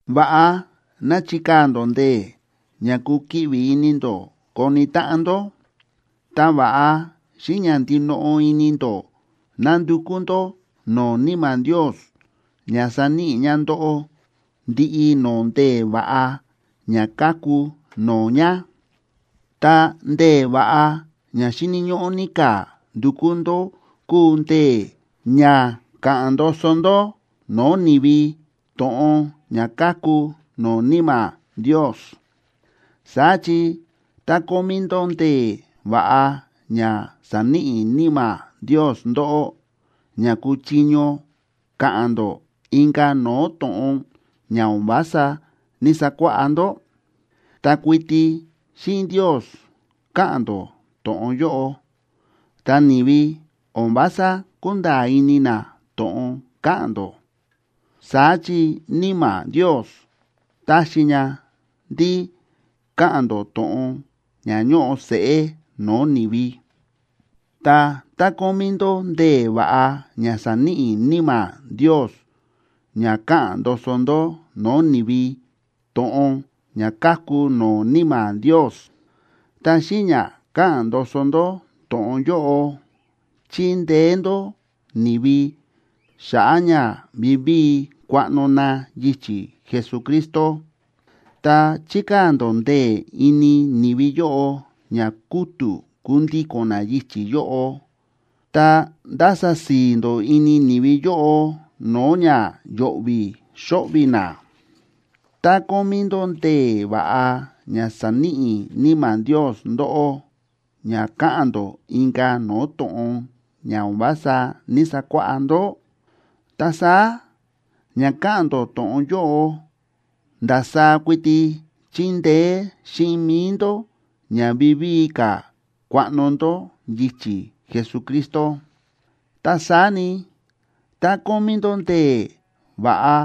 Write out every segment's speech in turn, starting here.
Va̱ꞌa ná chikaa̱ ndó ndee̱ ña kukiꞌvi ini ndó koni táꞌan ndó. Ta va̱ꞌa xíꞌin ña ndinoꞌo ini ndó ná ndukú ndó no̱o̱ Níma̱ Ndios ña saníꞌi ña ndóꞌó ndiꞌi no̱o̱ ndee̱ va̱ꞌa ña káku no̱o̱ ña. Ta ndee̱ va̱ꞌa ña xíni̱ ñóꞌó ní ka̱ ndukú ndó kúu ndee̱ ña ka̱ꞌa̱n ndoso ndó no̱o̱ ni̱vi to̱ꞌon ña káku no̱o̱ Níma̱ Ndios. Saá chi tá kómí ndó ndee̱ va̱ꞌa ña sa̱níꞌi Níma̱ Ndios ndóꞌó ña kúchiño ka̱ꞌa̱n ndó inka̱ no̱o̱ to̱ꞌon ña o̱n vása ní‑sakuáꞌá ndó, ta kuiti xíꞌin Ndios káꞌa̱n ndó to̱ꞌon yóꞌo, ta ni̱vi o̱n vása kúnda̱a̱ ini na to̱ꞌon káꞌa̱n ndó. Saá chi Níma̱ Ndios táxi ña ndí káꞌa̱n ndó to̱ꞌon ña ñóꞌo seꞌé no̱o̱ ni̱vi. Ta tá kómí ndó ndee̱ va̱ꞌa ña sa̱níꞌi Níma̱ Ndios ña káꞌa̱n ndoso ndó no̱o̱ ni̱vi to̱ꞌon ña káku no̱o̱ Níma̱ Ndios, ta xíꞌin ña káꞌa̱n ndoso ndó to̱ꞌon yóꞌo, chíndeé ndó ni̱vi xa̱ꞌa̱ ña vivíi kuaꞌno na yichi̱ Jesucristo, ta chíkaa̱ ndó ndee̱ ini ni̱vi yóꞌo ña kútu̱ kundíko̱n na yichi̱ yóꞌo, ta ndása si̱i̱ ndó ini ni̱vi yóꞌo no̱o̱ ña yo̱ꞌvi̱ xóꞌvi̱ na. Tá kómí ndó ndee̱ va̱ꞌa ña sa̱níꞌi Níma̱ Ndios ndóꞌó ña káꞌa̱n ndó inka̱ no̱o̱ to̱ꞌon ña o̱n vása ní‑sakuáꞌá ndó, ta saá ña káꞌa̱n ndó to̱ꞌon yóꞌo ndasaá kuiti chíndeé xíꞌin mi̱i ndó ña vivíi ka̱ kuaꞌno ndó yichi̱ Jesucristo. Ta saá ni, tá kómí ndó ndee̱ va̱ꞌa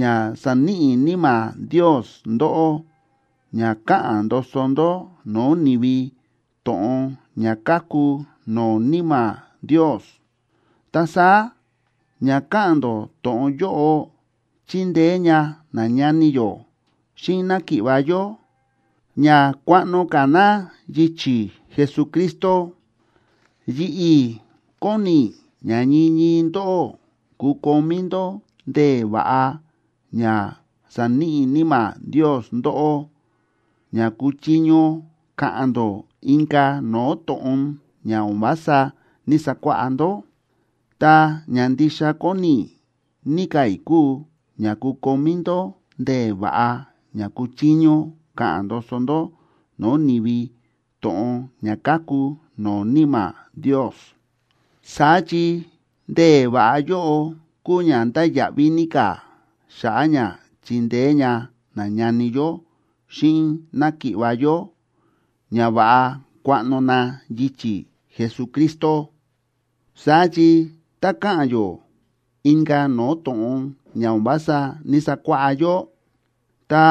ña sa̱níꞌi Níma̱ Ndios ndóꞌó ña káꞌa̱n ndoso ndó no̱o̱ ni̱vi to̱ꞌon ña káku no̱o̱ Níma̱ Ndios, ta saá ña káꞌa̱n ndó to̱ꞌon yóꞌo chíndeé ña nañani yó xíꞌin náki̱ꞌva̱ yó ña kuaꞌno ka̱ na yichi̱ Jesucristo. Yi̱ꞌi̱ kóni i̱ ña ñii ñii ndóꞌó kukomí ndó ndee̱ va̱ꞌa ña saníꞌi Níma̱ Ndios ndóꞌó ña kuchiño ka̱ꞌa̱n ndó inka̱ no̱o̱ to̱ꞌon ña o̱n vása ní‑sakuáꞌá ndó, ta ña ndixa kóni ní ka̱ i̱ kúu ña kukomí ndó ndee̱ va̱ꞌa ña kuchiño ka̱ꞌa̱n ndoso ndó no̱o̱ ni̱vi to̱ꞌon ña káku no̱o̱ Níma̱ Ndios. Saá chi ndee̱ va̱ꞌa yóꞌo kúu ña ndáya̱ꞌví ní ka̱ xa̱ꞌa̱ ña chindeé ña nañani yó xíꞌin náki̱ꞌva̱ yó ña va̱ꞌa kuaꞌno na yichi̱ Jesucristo. Saá chi tá káꞌa̱n yó inka̱ no̱o̱ to̱ꞌon ña o̱n vása ní‑sakuáꞌá yó, ta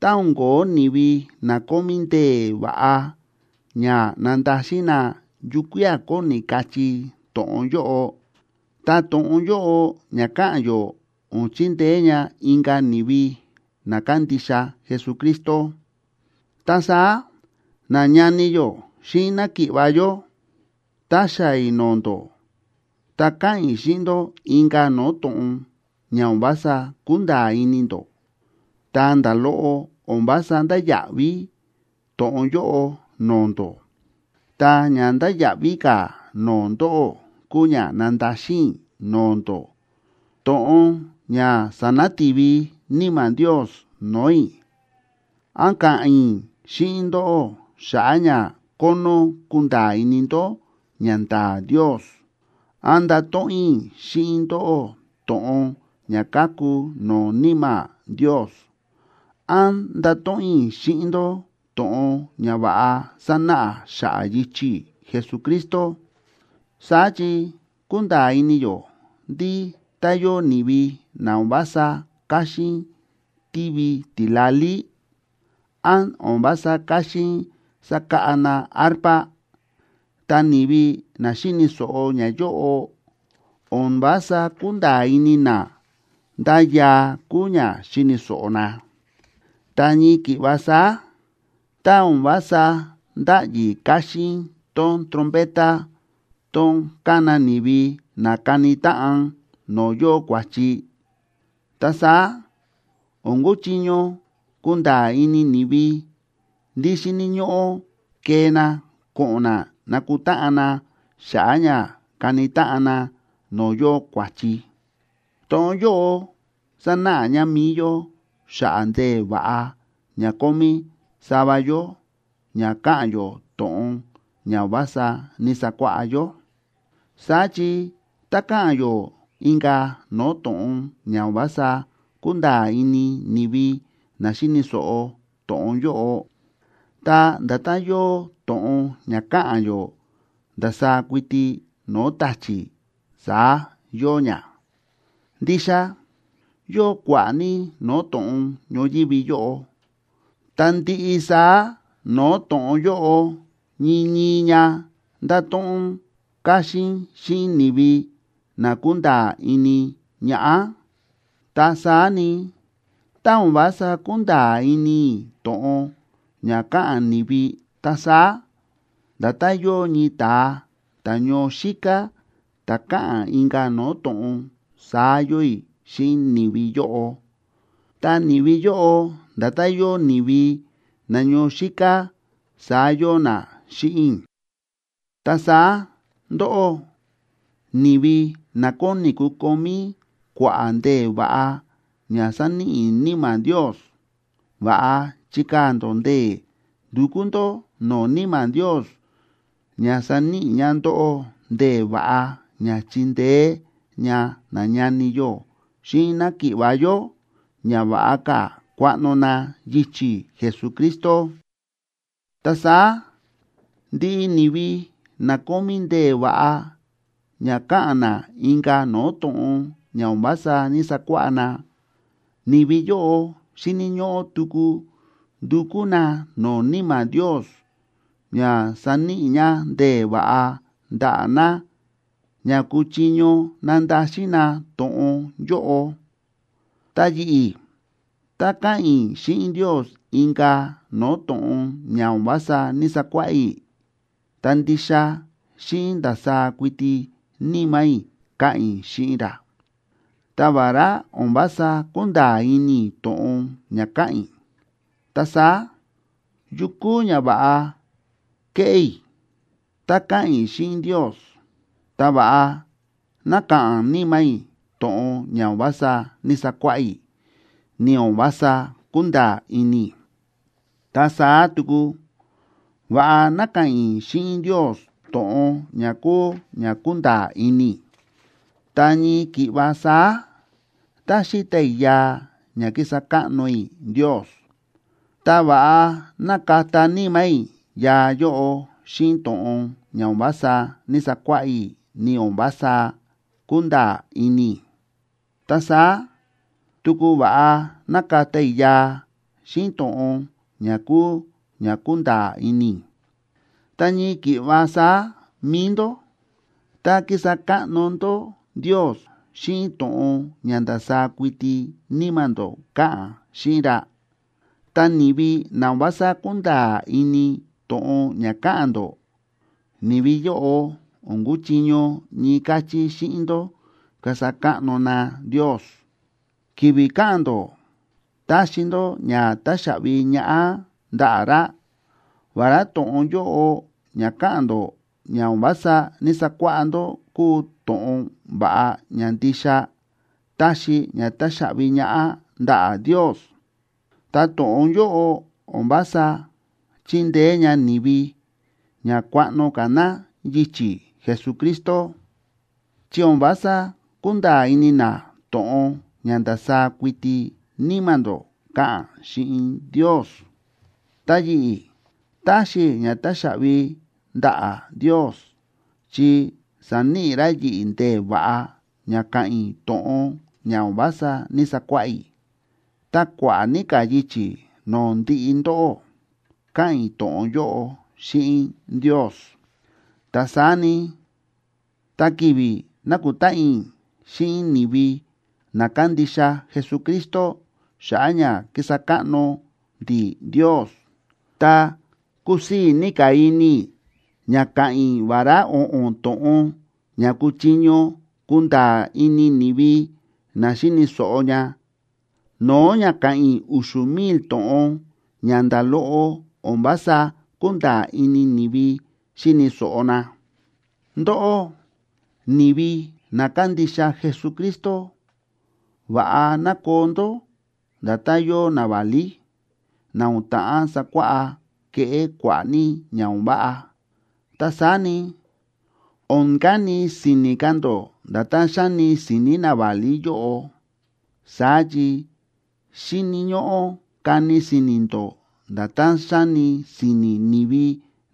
tá o̱n ko̱ó ni̱vi na kómí ndee̱ va̱ꞌa ña nandaxin na yukía̱ kóni kachí to̱ꞌon yóꞌo, ta to̱ꞌon yóꞌo ña káꞌa̱n yó o̱n chindeé ña inka̱ ni̱vi na kándixa Jesucristo. Ta saá, nañani yó xíꞌin náki̱ꞌva̱ yó, tá xaa̱ i̱ no̱o̱ ndó tá ka̱ꞌa̱n i̱ xíꞌin ndó inka̱ no̱o̱ to̱ꞌon ña o̱n vása kúnda̱a̱ ini ndó, ta nda̱ loꞌo o̱n vása ndáya̱ꞌví to̱ꞌon yóꞌo no̱o̱ ndó. Ta ña ndáya̱ꞌví ka̱ no̱o̱ ndóꞌó kúu ña nandaxin i̱ no̱o̱ ndó to̱ꞌon ña sa̱nati̱vi Níma̱ Ndios no̱o̱ i̱, án ka̱ꞌa̱n i̱ xíꞌin ndóꞌó xa̱ꞌa̱ ña kónó kunda̱a̱ ini ndó ñanda̱a̱ Ndios, án ndato̱ꞌon i̱ xíꞌin ndóꞌó to̱ꞌon ña káku no̱o̱ Níma̱ Ndios, án ndato̱ꞌon i̱ xíꞌin ndó to̱ꞌon ña va̱ꞌa sánáꞌa xa̱ꞌa̱ yichi̱ Jesucristo. Saá chi kúnda̱a̱ ini yó ndí tá yóo ni̱vi na o̱n vása káxín tívi tila̱lí, án o̱n vása káxín sákáꞌa na arpa, ta ni̱vi na xíni̱ so̱ꞌo ñayóꞌo o̱n vása kúnda̱a̱ ini na ndá yaa kúu ña xíni̱ so̱ꞌo na. Ta ñii ki̱ꞌva saá, tá o̱n vása ndáꞌyi káxín tón trompeta tón kána ni̱vi ná kani táꞌan no̱o̱ yóo kua̱chi, ta saá o̱n kúchiño kunda̱a̱ ini ni̱vi ndí xíni̱ ñóꞌó kee na ko̱ꞌo̱n na nakutáꞌan na xa̱ꞌa̱ ña kani táꞌan na no̱o̱ yóo kua̱chi. To̱ꞌon yóꞌo sánáꞌa ña mi̱i yó xa̱ꞌa̱ ndee̱ va̱ꞌa ña kómí sava yó ña káꞌa̱n yó to̱ꞌon ña o̱n vása ní‑sakuáꞌá yó. Saá chi tá káꞌa̱n yó inka̱ no̱o̱ to̱ꞌon ña o̱n vása kúnda̱a̱ ini ni̱vi na xíni̱ so̱ꞌo to̱ꞌon yóꞌo, ta nda̱tán yóo to̱ꞌon ña káꞌa̱n yó ndasaá kuiti no̱o̱ ta̱chi̱, saá yóo ña. Ndixa yóo kua̱ꞌa̱ ní no̱o̱ to̱ꞌon ñoyívi yóꞌo, ta ndiꞌi saá no̱o̱ to̱ꞌon yóꞌo ñii ñii ña ndáto̱ꞌon káxín xíꞌin ni̱vi na kúnda̱a̱ ini ñaꞌá. Ta saá ni, tá o̱n vása kúnda̱a̱ ini i̱ to̱ꞌon ña káꞌa̱n ni̱vi, ta saá nda̱tán yóo ñii ta̱a ta̱ ñoo xíká ta̱ káꞌa̱n inka̱ no̱o̱ to̱ꞌon saá yóo i̱ xíꞌin ni̱vi yóꞌo, ta ni̱vi yóꞌo nda̱tán yóo ni̱vi na ñoo xíká saá yóo na xíꞌin i̱. Ta saá ndóꞌó, ni̱vi na kóni kukomí kua̱ꞌa̱ ndee̱ va̱ꞌa ña sáníꞌi Níma̱ Ndios, va̱ꞌa chikaa̱ ndó ndee̱ ndukú ndó no̱o̱ Níma̱ Ndios ña saníꞌi ña ndóꞌó ndee̱ va̱ꞌa ña chindeé ña nañani yó xíꞌin náki̱ꞌva̱ yó ña va̱ꞌa ka̱ kuaꞌno na yichi̱ Jesucristo. Ta saá ndiꞌi ni̱vi na kómí ndee̱ va̱ꞌa ña káꞌa̱n na inka̱ no̱o̱ to̱ꞌon ña o̱n vása ní‑sakuáꞌá na, ni̱vi yóꞌo xíni̱ ñóꞌó tuku ndukú na no̱o̱ Níma̱ Ndios ña saníꞌi ña ndee̱ va̱ꞌa ndaꞌa̱ na ña kuchiño nandaxin na to̱ꞌon yóꞌo. Ta yi̱ꞌi̱, tá káꞌa̱n i̱ xíꞌin Ndios inka̱ no̱o̱ to̱ꞌon ña o̱n vása ní‑sakuáꞌá i̱, ta ndixa xíꞌin ndasaá kuiti níma̱ i̱ káꞌa̱n i̱ xíꞌin ra, ta vará o̱n vása kúnda̱a̱ ini i̱ to̱ꞌon ña káꞌa̱n i̱. Ta saá, ¿yu kúu ñava̱ꞌa keꞌé i̱? Tá káꞌa̱n i̱ xíꞌin Ndios, ta va̱ꞌa ná ka̱ꞌa̱n níma̱ i̱ to̱ꞌon ña o̱n vása ní‑sakuáꞌá i̱, ni o̱n vása kúnda̱a̱ ini i̱. Ta saá tuku va̱ꞌa ná ka̱ꞌa̱n i̱ xíꞌin Ndios to̱ꞌon ña kúu ña kúnda̱a̱ ini i̱. Ta ñii ki̱ꞌva saá, tá xíta i̱ yaa ña kísa káꞌno i̱ Ndios, ta va̱ꞌa ná kata níma̱ i̱ yaa yóꞌo xíꞌin to̱ꞌon ña o̱n vása ní‑sakuáꞌá i̱, ni o̱n vása kúnda̱a̱ ini i̱. Ta saá tuku va̱ꞌa ná kata i̱ yaa xíꞌin to̱ꞌon ña kúu ña kúnda̱a̱ ini i̱. Ta ñii ki̱ꞌva saá mi̱i ndó, tá kísa káꞌno ndó Ndios xíꞌin to̱ꞌon ña ndasaá kuiti níma̱ ndó káꞌa̱n xíꞌin ra, ta ni̱vi na o̱n vása kúnda̱a̱ ini to̱ꞌon ña káꞌa̱n ndó, ni̱vi yóꞌo o̱n kúchiño ñii káchí xíꞌin ndó kasa káꞌno na Ndios, ki̱vi̱ káꞌa̱n ndó táxi ndó ña táxaꞌvi ñaꞌá ndaꞌa̱ ra. Vará to̱ꞌon yóꞌo ña káꞌa̱n ndó ña o̱n vása ní‑sakuáꞌá ndó kúu to̱ꞌon va̱ꞌa ña ndixa táxi ña táxaꞌvi ñaꞌá ndaꞌa̱ Ndios, ta to̱ꞌon yóꞌo o̱n vása chíndeé ña ni̱vi ña kuaꞌno ka̱ na yichi̱ Jesucristo, chi o̱n vása kúnda̱a̱ ini na to̱ꞌon ña ndasaá kuiti níma̱ ndó káꞌa̱n xíꞌin Ndios. Ta yi̱ꞌi̱, táxi i̱ ña táxaꞌvi ndaꞌa̱ Ndios chi sa̱níꞌi ra yi̱ꞌi̱ ndee̱ va̱ꞌa ña káꞌa̱n i̱ to̱ꞌon ña o̱n vása ní‑sakuáꞌá i̱, ta kua̱ꞌa̱ ní ka̱ yichi̱ no̱o̱ ndiꞌi ndóꞌó káꞌa̱n i̱ to̱ꞌon yóꞌo xíꞌin Ndios. Ta saá ni, tá ki̱vi̱ nákutáꞌan i̱ xíꞌin ni̱vi na kándixa Jesucristo xa̱ꞌa̱ ña kísa káꞌno ndi̱ Ndios, ta kusii̱ ní ka̱ ini i̱ ña ka̱ꞌa̱n i̱ vará o̱ꞌo̱n to̱ꞌon ña kúchiño kunda̱a̱ ini ni̱vi na xíni̱ so̱ꞌo ña, no̱o̱ ña ka̱ꞌa̱n i̱ u̱xu̱ mil to̱ꞌon ña nda̱ loꞌo o̱n vása kúnda̱a̱ ini ni̱vi xíni̱ so̱ꞌo na. Ndóꞌó ni̱vi na kándixa Jesucristo, va̱ꞌa ná koo ndó nda̱tán yóo naválí na o̱n ta̱ꞌán sakuáꞌá keꞌé kua̱ꞌa̱ ní ña o̱n váꞌa, ta saá ni, o̱n kani si̱ni̱ ka̱ ndó nda̱tán xáni si̱ni̱ naválí yóꞌo. Saá chi xíni̱ ñóꞌó kani si̱ni̱ ndó nda̱tán xáni si̱ni̱ ni̱vi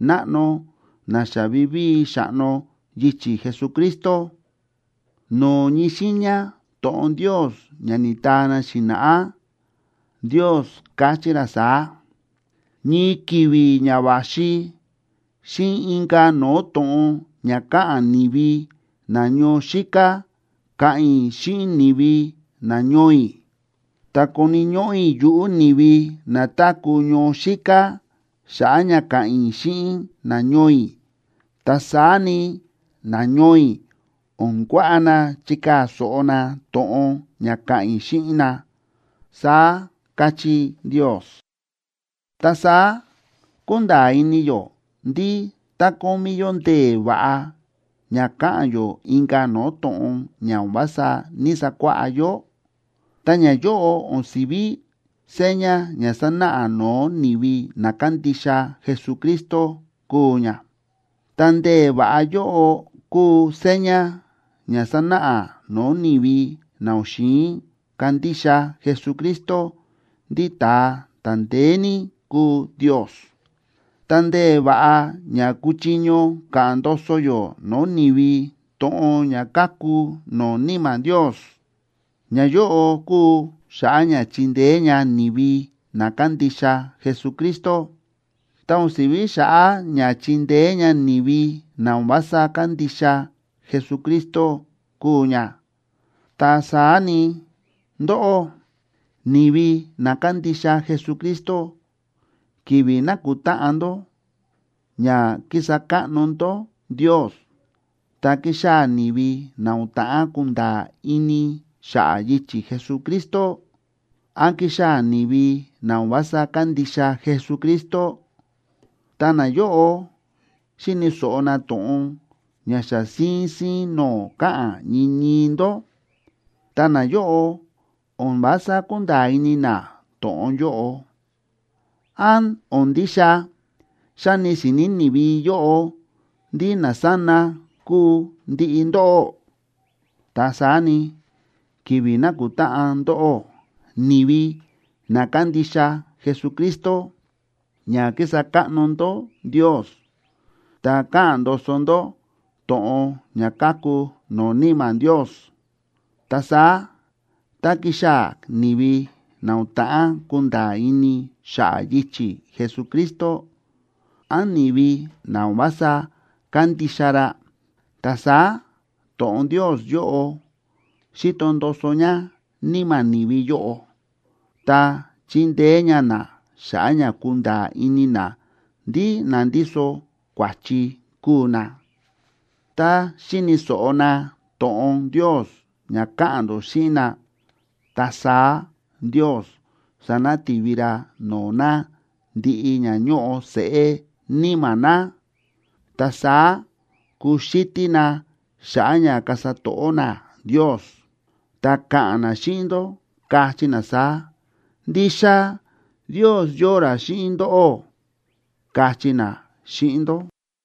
náꞌno na xa vivíi xa̱ꞌno yichi̱ Jesucristo. No̱o̱ ñii xiiña to̱ꞌon Ndios ña ni̱taa na xi̱na̱ꞌá, Ndios káchí ra saá: “Ñii ki̱vi̱ ña va̱xi, xíꞌin inka̱ no̱o̱ to̱ꞌon ña káꞌa̱n ni̱vi na ñoo xíká ka̱ꞌa̱n i̱ xíꞌin ni̱vi nañoo i̱, ta koni̱ ñóꞌó i̱ yuꞌu̱ ni̱vi na táku̱ ñoo xíká xa̱ꞌa̱ ña ka̱ꞌa̱n i̱ xíꞌin nañoo i̱. Ta saá ni, nañoo i̱ o̱n kuaꞌa na chikaa̱ so̱ꞌo na to̱ꞌon ña ka̱ꞌa̱n i̱ xíꞌin na”, saá káchí Ndios. Ta saá kúnda̱a̱ ini yó ndí tá kómí yó ndee̱ va̱ꞌa ña káꞌa̱n yó inka̱ no̱o̱ to̱ꞌon ña o̱n vása ní‑sakuáꞌá yó, ta ñayóꞌo o̱n si̱ví seña ña sánáꞌa no̱o̱ ni̱vi na kándixa Jesucristo kúu ña, ta ndee̱ va̱ꞌa yóꞌo kúu seña ña sánáꞌa no̱o̱ ni̱vi na o̱n xi̱in kandixa Jesucristo ndí ta̱a ta̱ ndeé ní kúu Ndios. Ta ndee̱ va̱ꞌa ña kúchiño ka̱ꞌa̱n ndoso yó no̱o̱ ni̱vi to̱ꞌon ña káku no̱o̱ Níma̱ Ndios, ñayóꞌo kúu xa̱ꞌa̱ ña chindeé ña ni̱vi na kándixa Jesucristo, ta o̱n si̱ví xa̱ꞌa̱ ña chindeé ña ni̱vi na o̱n vása kándixa Jesucristo kúu ña. Ta saá ni, ndóꞌó, ni̱vi na kándixa Jesucristo, ki̱vi̱ nákutáꞌan ndó ña kísa káꞌno ndó Ndios, tá kixaa̱ ni̱vi na o̱n ta̱ꞌán kunda̱a̱ ini xa̱ꞌa̱ yichi̱ Jesucristo, án kixaa̱ ni̱vi na o̱n vása kándixa Jesucristo, ta nayóꞌo xíni̱ so̱ꞌo na to̱ꞌon ña xa síín síín no̱o̱ káꞌa̱n ñii ñii ndó, ta nayóꞌo o̱n vása kúnda̱a̱ ini na to̱ꞌon yóꞌo, ¿án o̱n ndixa xáni si̱ni̱ ni̱vi yóꞌo ndí nasána kúu ndiꞌi ndóꞌó? Ta saá ni, ki̱vi̱ nákutáꞌan ndóꞌó, ni̱vi na kándixa Jesucristo, ña kísa káꞌno ndó Ndios, ta káꞌa̱n ndoso ndó to̱ꞌon ña káku no̱o̱ Níma̱ Ndios, ta saá tá kixaa̱ ni̱vi na o̱n ta̱ꞌán kunda̱a̱ ini xa̱ꞌa̱ yichi̱ Jesucristo, án ni̱vi na o̱n vása kándixa ra, ta saá to̱ꞌon Ndios yóꞌo xíto ndoso ña níma̱ ni̱vi yóꞌo, ta chíndeé ña na xa̱ꞌa̱ ña kunda̱a̱ ini na ndí na ndíso kua̱chi kúu na. Tá xíni̱ so̱ꞌo na to̱ꞌon Ndios ña káꞌa̱n ndó xíꞌin na, ta saá Ndios sanati̱vi ra no̱o̱ na ndiꞌi ña ñóꞌo seꞌé níma̱ na. Ta saá kuxítí na xa̱ꞌa̱ ña kasa to̱ꞌó na Ndios, ta ka̱ꞌa̱n na xíꞌin ndó, kachí na saá: “Ndixa Ndios yóo ra xíꞌin ndóꞌó”, kachí na xíꞌin ndó.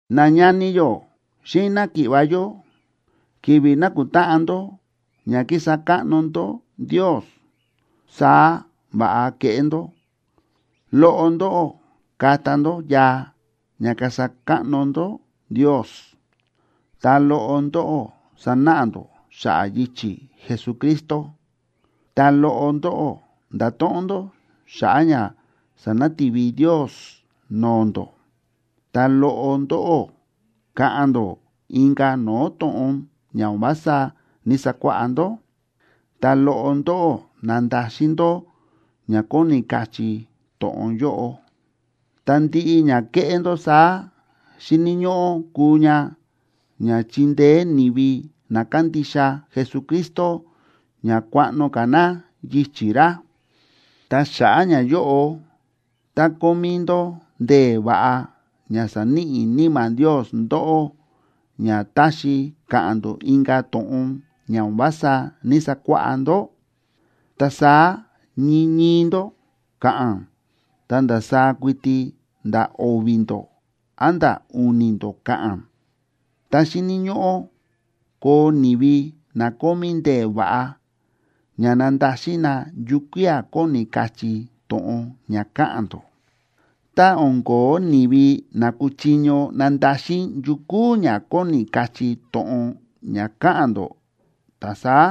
Nañani yó xíꞌin náki̱ꞌva̱ yó, ki̱vi̱ nákutáꞌan ndó ña kísa káꞌno ndó Ndios, saá va̱ꞌa keꞌé ndó: Loꞌo ndóꞌó kata ndó yaa ña kasa káꞌno ndó Ndios, ta loꞌo ndóꞌó sanáꞌa ndó xa̱ꞌa̱ yichi̱ Jesucristo, ta loꞌo ndóꞌó ndato̱ꞌon ndó xa̱ꞌa̱ ña sánati̱vi Ndios no̱o̱ ndó, ta loꞌo ndóꞌó ka̱ꞌa̱n ndó inka̱ no̱o̱ to̱ꞌon ña o̱n vása ní‑sakuáꞌá ndó, ta loꞌo ndóꞌó nandaxin ndó ña kóni kachí to̱ꞌon yóꞌo. Ta ndiꞌi ña kéꞌé ndó saá xíni̱ ñóꞌó kuu ña ña chindeé ni̱vi na kándixa Jesucristo ña kuaꞌno ka̱ na yichi̱ ra. Ta xa̱ꞌa̱ ñayóꞌo, tá kómí ndó ndee̱ va̱ꞌa ña sa̱níꞌi Níma̱ Ndios ndóꞌó ña táxi káꞌa̱n ndó inka̱ to̱ꞌon ña o̱n vása ní‑sakuáꞌá ndó, ta saá ñii ñii ndó ka̱ꞌa̱n, ta ndasaá kuiti nda̱ o̱vi̱ ndó a̱nda̱ u̱ni̱ ndó ka̱ꞌa̱n. Ta xíni̱ ñóꞌó koo ni̱vi na kómí ndee̱ va̱ꞌa ña nandaxin na yukía̱ kóni kachí to̱ꞌon ña káꞌa̱n ndó. Tá o̱n ko̱ó ni̱vi na kúchiño nandaxin yu kúu ña kóni kachí to̱ꞌon ña káꞌa̱n ndó, ta saá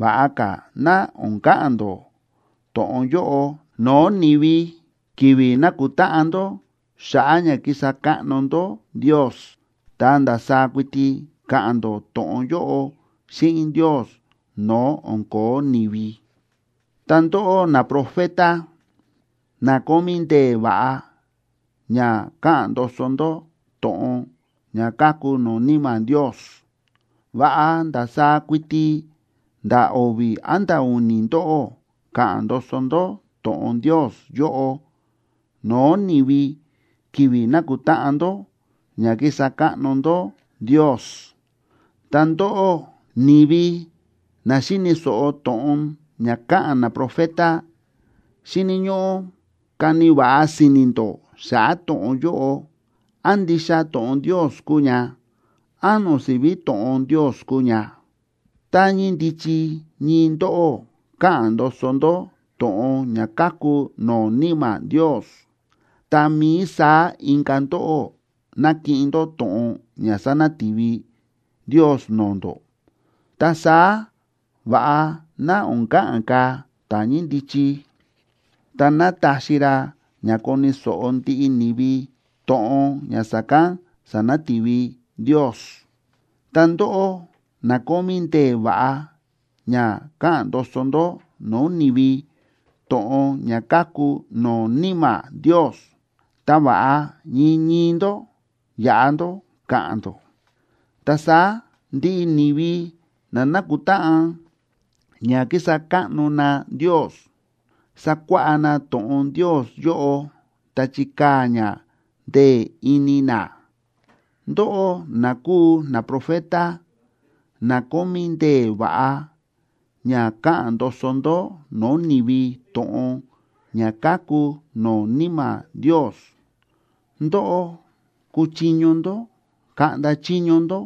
va̱ꞌa ka̱ ná o̱n ka̱ꞌa̱n ndó to̱ꞌon yóꞌo no̱o̱ ni̱vi ki̱vi̱ nákutáꞌan ndó xa̱ꞌa̱ ña kísa káꞌno ndó Ndios, ta ndasaá kuiti ka̱ꞌa̱n ndó to̱ꞌon yóꞌo xíꞌin Ndios no̱o̱ o̱n ko̱ó ni̱vi. Ta ndóꞌó naprofeta, na kómí ndee̱ va̱ꞌa ña káꞌa̱n ndoso ndó to̱ꞌon ña káku no̱o̱ Níma̱ Ndios, va̱ꞌa ndasaá kuiti nda̱ o̱vi̱ a̱nda̱ u̱ni̱ ndóꞌó ka̱ꞌa̱n ndoso ndó to̱ꞌon Ndios yóꞌo no̱o̱ ni̱vi ki̱vi̱ nákutáꞌan ndó ña kísa káꞌno ndó Ndios. Ta ndóꞌó, ni̱vi na xíni̱ so̱ꞌo to̱ꞌon ña káꞌa̱n naprofeta, xíni̱ ñóꞌó kani va̱ꞌa si̱ni̱ ndó xa̱ꞌa̱ to̱ꞌon yóꞌo, án ndixa to̱ꞌon Ndios kúu ña, án o̱n si̱ví to̱ꞌon Ndios kúu ña. Tá ñíndichi ñii ndóꞌó káꞌa̱n ndoso ndó to̱ꞌon ña káku no̱o̱ Níma̱ Ndios, tá mií saá inka̱ ndóꞌó nákiꞌin ndó to̱ꞌon ña sa̱nati̱vi Ndios no̱o̱ ndó, ta saá, va̱ꞌa ná o̱n ka̱ꞌa̱n ka̱ ta̱ ñíndichi, ta ná taxi ra ña koni̱ so̱ꞌo ndiꞌi ni̱vi to̱ꞌon ña sa̱kán sa̱nati̱vi Ndios. Ta ndóꞌó na kómí ndee̱ va̱ꞌa ña káꞌa̱n ndoso ndó no̱o̱ ni̱vi to̱ꞌon ña káku no̱o̱ Níma̱ Ndios, ta va̱ꞌa ñii ñii ndó yaꞌa ndó ka̱ꞌa̱n ndó. Ta saá ndiꞌi ni̱vi na nákutáꞌan ña kísa káꞌno na Ndios, sakuáꞌá na to̱ꞌon Ndios yóꞌo ta chikaa̱ ña ndee̱ ini na. Ndóꞌó na kúu naprofeta na kómí ndee̱ va̱ꞌa ña káꞌa̱n ndoso ndó no̱o̱ ni̱vi to̱ꞌon ña káku no̱o̱ Níma̱ Ndios, ndóꞌó kúchiño ndó kaꞌnda chiño ndó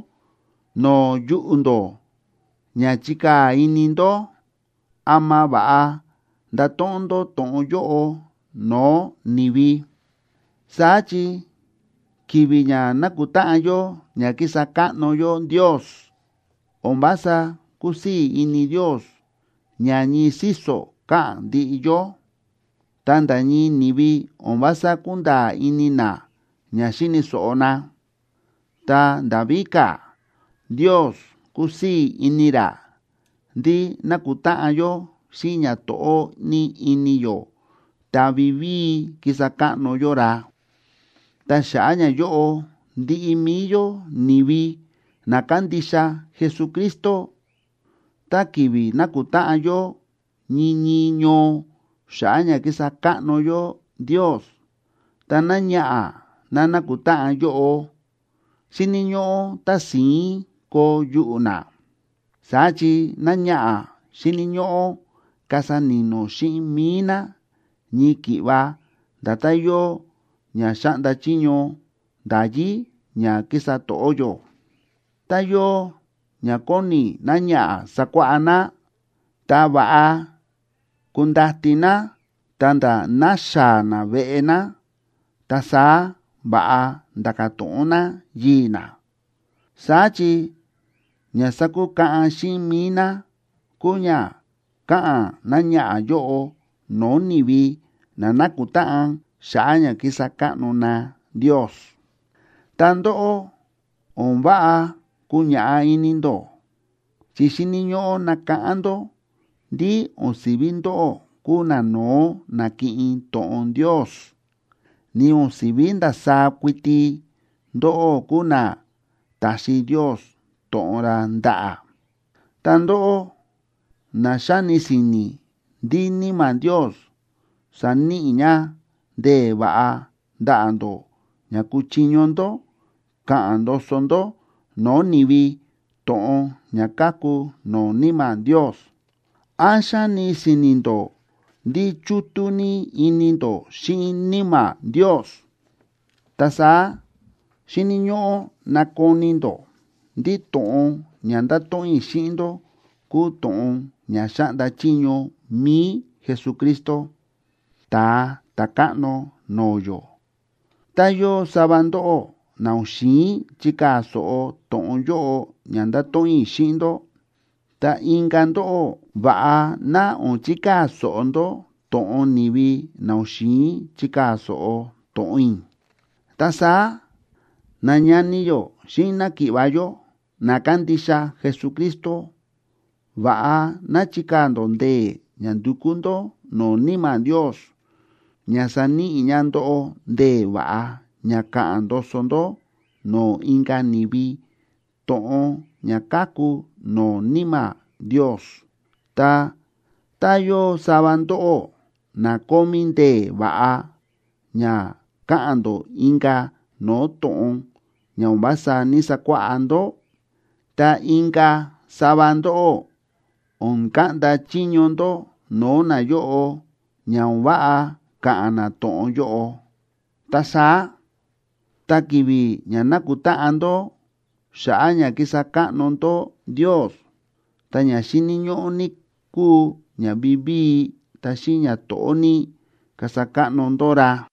no̱o̱ yuꞌu̱ ndó ña chikaa̱ ini ndó ama va̱ꞌa ndato̱ꞌon ndó to̱ꞌon yóꞌo no̱o̱ ni̱vi. Saá chi ki̱vi̱ ña nákutáꞌan yó ña kísa káꞌno yó Ndios, o̱n vása kúsii̱ ini Ndios ña ñii síso̱ káꞌa̱n ndiꞌi yó, ta nda̱ ñii ni̱vi o̱n vása kúnda̱a̱ ini na ña xíni̱ so̱ꞌo na. Ta nda̱ víka̱, Ndios kúsii̱ ini ra ndí nákutáꞌan yó xíꞌin ñato̱ꞌó ní ini yó ta vivíi kísa káꞌno yó ra. Ta xa̱ꞌa̱ ñayóꞌo, ndiꞌi mi̱i yó ni̱vi na kándixa Jesucristo, tá ki̱vi̱ nákutáꞌan yó ñii ñii ñoo xa̱ꞌa̱ ña kísa káꞌno yó Ndios, ta náñaꞌa̱ ná nákutáꞌan yóꞌo, xíni̱ ñóꞌó tási̱ín koo yuꞌu̱ ná. Saá chi náñaꞌa̱ xíni̱ ñóꞌó kasa ni̱no̱ xíꞌin mi̱i ná, ñii ki̱ꞌva nda̱tán yóo ña xáꞌnda chiño nda̱yí ña kísa to̱ꞌó yó. Tá yóo ña kóni náñaꞌa̱ sakuáꞌá ná, ta va̱ꞌa kundati ná ta̱nda̱ naxaa̱ ná veꞌe ná, ta saá va̱ꞌa nda̱ka̱ to̱ꞌon ná yii̱ ná. Saá chi ña sákukaꞌan xíꞌin mi̱i ná kúu ña káꞌa̱n náñaꞌa̱ yóꞌo no̱o̱ ni̱vi na nákutáꞌan xa̱ꞌa̱ ña kísa káꞌno na Ndios. Ta ndóꞌó, o̱n váꞌa kuñaꞌá ini ndó, chi xíni̱ ñóꞌó nakáꞌán ndó ndí o̱n si̱ví ndóꞌó kúu nano̱ó na̱kiꞌin to̱ꞌon Ndios, ni o̱n si̱ví ndasaá kuiti ndóꞌó kúu na ta̱xi Ndios to̱ꞌon ra ndaꞌa̱. Ta ndóꞌó na xáni si̱ni̱ ndí Níma̱ Ndios sa̱níꞌi ña ndee̱ va̱ꞌa ndaꞌa̱ ndó ña kúchiño ndó ka̱ꞌa̱n ndoso ndó no̱o̱ ni̱vi to̱ꞌon ña káku no̱o̱ Níma̱ Ndios, ¿án xáni si̱ni̱ ndó ndí chútú ní ini ndó xíꞌin Níma̱ Ndios?, ta saá xíni̱ ñóꞌó nakoni ndó ndí to̱ꞌon ña ndáto̱ꞌon i̱ xíꞌin ndó kúu to̱ꞌon ña xáꞌnda chiño mi̱i Jesucristo, Ta̱a Ta̱káꞌno no̱o̱ yó. Tá yóo sava ndóꞌó na o̱n xi̱in chikaa̱ so̱ꞌo to̱ꞌon yóꞌo ña ndáto̱ꞌon i̱ xíꞌin ndó, ta inka̱ ndóꞌó, va̱ꞌa ná o̱n chikaa̱ so̱ꞌo ndó to̱ꞌon ni̱vi na o̱n xi̱in chikaa̱ so̱ꞌo to̱ꞌon i̱. Ta saá, nañani yó xíꞌin náki̱ꞌva̱ yó, na kándixa Jesucristo, va̱ꞌa ná chikaa̱ ndó ndee̱ ña ndukú ndó no̱o̱ Níma̱ Ndios ña saníꞌi ña ndóꞌó ndee̱ va̱ꞌa ña ka̱ꞌa̱n ndoso ndó no̱o̱ inka̱ ni̱vi to̱ꞌon ña káku no̱o̱ Níma̱ Ndios. Ta, tá yóo sava ndóꞌó na kómí ndee̱ va̱ꞌa ña káꞌa̱n ndó inka̱ no̱o̱ to̱ꞌon ña o̱n vása ní‑sakuáꞌá ndó, ta inka̱ sava ndóꞌó o̱n kaꞌnda chiño ndó no̱o̱ nayóꞌo ña o̱n váꞌa ka̱ꞌa̱n na to̱ꞌon yóꞌo. Ta saá, tá ki̱vi̱ ña nákutáꞌan ndó xa̱ꞌa̱ ña kísa káꞌno ndó Ndios, ta ña xíni̱ ñóꞌó ní kúu ña vivíi ta xíꞌin ñato̱ꞌó ní kasa káꞌno ndó ra.